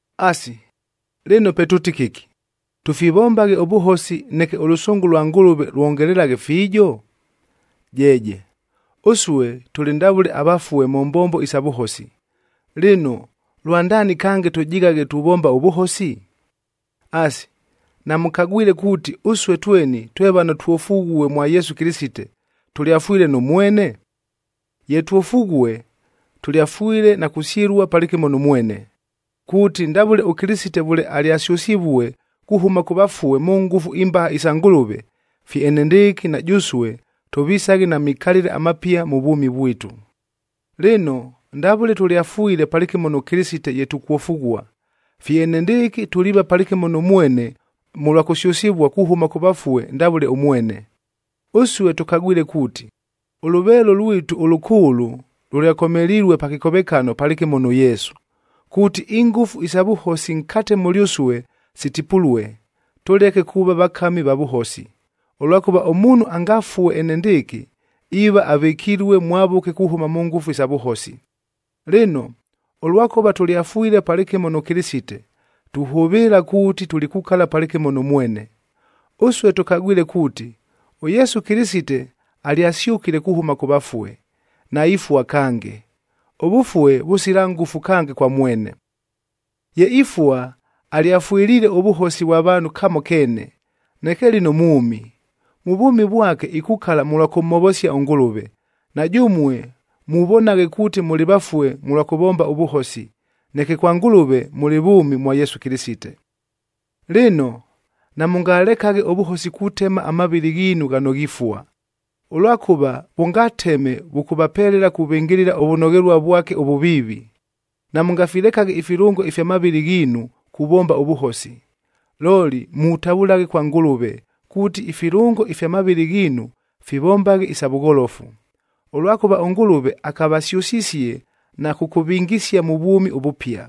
Asi, lɨno pe tʉʉti kɨki? Tʉfivombaghe ʉvʉhosi neke ʉlʉsʉngʉ lwa Ngʉlʉve lwongelelaghe fiijo? Jeeje! Ʉsue tʉlɨ ndavʉle avafue mʉ mbombo isa vʉhosi, lɨno lwandaani kange tʉjighaghe tuvomba ʉvʉhosi? Asi, namʉkagwile kuuti, ʉsue tweni twe vano twofughue mwa Yesu Kɨlɨsite, tʉlyafwile nʉ mwene? Ye twofughue, tʉlyafwile na kusyɨlua palɨkɨmo nʉ mwene, kuuti ndavʉle ʉKɨlɨsite vʉle alyasyʉsivue kuhʉma kʉ vafue mʉ ngʉfu imbaha isa Ngʉlʉve, fye enendɨɨkɨ na jʉsue tʉvisaghe na mikalɨle amapia mʉ vwʉmi vwitu. Lɨno, ndavʉle tʉlyafwile palɨkɨmo nʉ Kɨlɨsite ye tukwofughua, fye enendɨɨkɨ tuliiva palɨkɨmo nʉ mwene mʉlwa kusyʉsɨvua kuhʉma kʉ vafue ndavʉle ʉmwene. Ʉsue tʉkagwile kuuti, ʉlʉveelo lwitu ʉlʉkʉʉlʉ lʉlyakomelilue pa kɨkovekano palɨkɨmo nʉ Yesu, kuuti ingʉfu isa vʉhosi nkate mʉlyʉsue sitipulue, tʉleke kuuva vakami va vʉhosi, ʉlwakʉva ʉmuunhu angafue enendɨɨkɨ, iiva avɨkilue mwavʉke kuhʉma mʉ ngʉfu isa vʉhosi. Lɨno, ʉlwakʉva tʉlyafwile palɨkɨmo nʉ Kɨlɨsite, tuhʉvɨɨla kuuti tulikukala palɨkɨmo nʉ mwene. Ʉsue tʉkagwile kuuti, ʉYesu Kɨlɨsite alyasyʉkile kuhʉma kʉ vafue, naifua kange, ʉvʉfue vʉsila ngʉfu kange kwa mwene. Ye ifua, alyafwɨliile ʉvʉhosi vwa vaanhu kamo keene. Neke lɨno mwʉmi, mʉ vwʉmi vwake ikukala mʉlwa kʉmhovosia ʉNgʉlʉve. Na jʉmue muvonaghe kuuti mʉlɨ vafue mʉlwa kʉvomba ʉvʉhosi, neke kwa Ngʉlʉve mʉlɨ vʉʉmi mwa Yesu Kɨlɨsite. Lɨno, namʉngalekaghe ʉvʉhosi kutema amavɨlɨ ghiinu ghano ghifua, ʉlwakʉva vʉngateme vʉkʉvapelela kuvɨngɨlɨla ʉvʉnoghelua vwake ʉvʉviivi. Namʉngafilekaghe ifilʉngo ifya mavɨlɨ ghiinu kuvomba ʉvʉhosi. Looli mutavʉlaghe kwa Ngʉlʉve, kuuti ifilʉngo ifya mavɨlɨ ghiinu fivombaghe isa vʉgholofu, ʉlwakʉva ʉNgʉlʉve akavasyʉsisie na kʉkʉvingisia mʉ vwʉmi ʉvʉpia.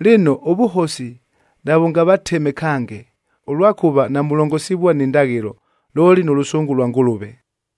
Lɨno, ʉvʉhosi navʉngavateme kange, ʉlwakʉva namulongosivua ni ndaghɨlo, looli nʉ lʉsʉngʉ lwa Ngʉlʉve.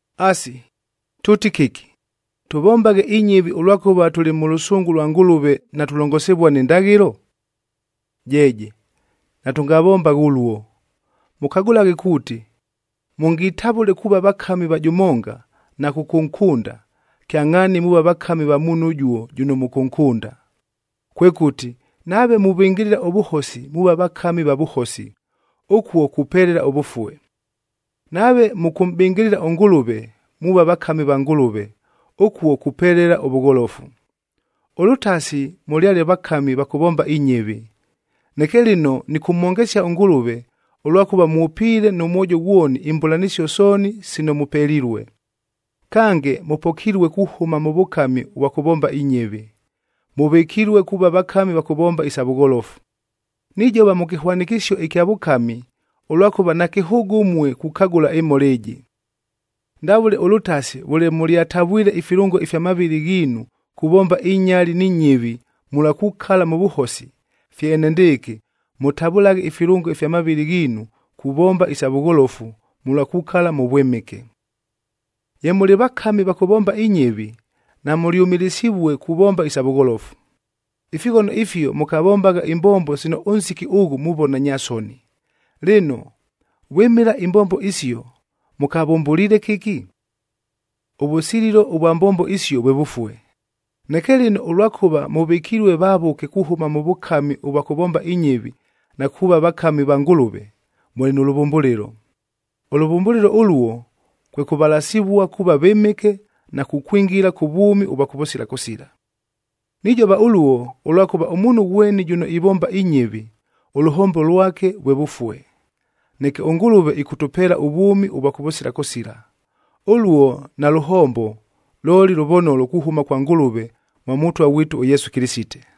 Asi, tʉʉti kɨki? Tʉvombaghe inyɨvi ʉlwakʉva tʉlɨ mʉ lʉsʉngʉ lwa Ngʉlʉve, natulongosivua ni ndaghɨlo? Jeeje, natʉngavombaghe ʉluo! Mʉkagʉlaghe kuuti, mʉngitavʉle kuuva vakami va jʉmonga na kʉkʉnkʉnda, kyangʼhaani muuva vakami va muunhu ʉjuo jʉno mʉkʉnkʉnda. Kwekʉti, nave muvɨngɨlɨla ʉvʉhosi muuva vakami va vʉhosi, ʉkuo kupelela ʉvʉfue. Nave mʉkʉmʼbɨngɨlɨla ʉNgʉlʉve muuva vakami va Ngʉlʉve, ʉkuo kupelela ʉvʉgholofu. Ʉlʉtasi mʉlyale vakami va kʉvomba inyɨvi, neke lɨno nɨkʉmhongesia ʉNgʉlʉve, ʉlwakʉva mwʉpiile nʉ mwojo ghwoni imbʉlanɨsio sooni sino mʉpelilue. Kange, mʉpokilue kuhʉma mʉ vʉkami ʉvwa kʉvomba inyɨvi, mʉvɨkilue kuuva vakami va kʉvomba isa vʉgholofu. Nijova mʉ kɨhwanɨkɨsio ɨkya vʉkami, ʉlwakʉva nakɨhʉʉgʉ ʉmue kukagʉla ɨmhola ɨjɨ. Ndavʉle ʉlʉtasi vʉle mʉlyatavwile ifilʉngo ifya mavɨlɨ ghiinu kuvomba inyali ni nyɨvi mʉlwa kukala mʉ vʉhosi, fye enendɨɨkɨ mʉtavʉlaghe ifilʉngo ifya mavɨlɨ ghiinu kuvomba isa vʉgholofu mʉlwa kukala mʉ vwɨmɨke. Ye mʉlɨ vakami va kʉvomba inyɨvi, namʉlyʉmɨlɨsivue kuvomba isa vʉgholofu. Ifighono ifio mʉkavombagha imbombo sino ʉnsiki ʉghʉ muvona nya soni. Lɨno, vwɨmɨla imbombo isio mʉkavʉmbʉliile kɨki? Ʉvʉsililo ʉvwa mbombo isio vwe vʉfue. Neke lɨno ʉlwakʉva mʉvɨkilue vavʉke kuhʉma mʉ vʉkami ʉvwa kʉvomba inyɨvi na kuuva vakami va Ngʉlʉve, mʉlɨ nʉ lʉvʉmbʉlɨlo. Ʉlʉvʉmbʉlɨlo ʉluo kwe kʉvalasivua kuuva vɨmɨke na kukwingila kʉ vwʉmi ʉvwa kʉvʉsila kʉsila. Nijova ʉluo, ʉlwakʉva ʉmuunhu ghweni jʉno ivomba inyɨvi, ʉlʉhombo lwake vwe vʉfue. Neke ʉNgʉlʉve ɨkʉtʉpeela ʉvwʉmi ʉvwa kʉvʉsila kʉsila, ʉluo nalʉhombo looli lʉvonolo kuhʉma kwa Ngʉlʉve mwa Mʉtwa ghwitu ʉYesu Kɨlɨsite.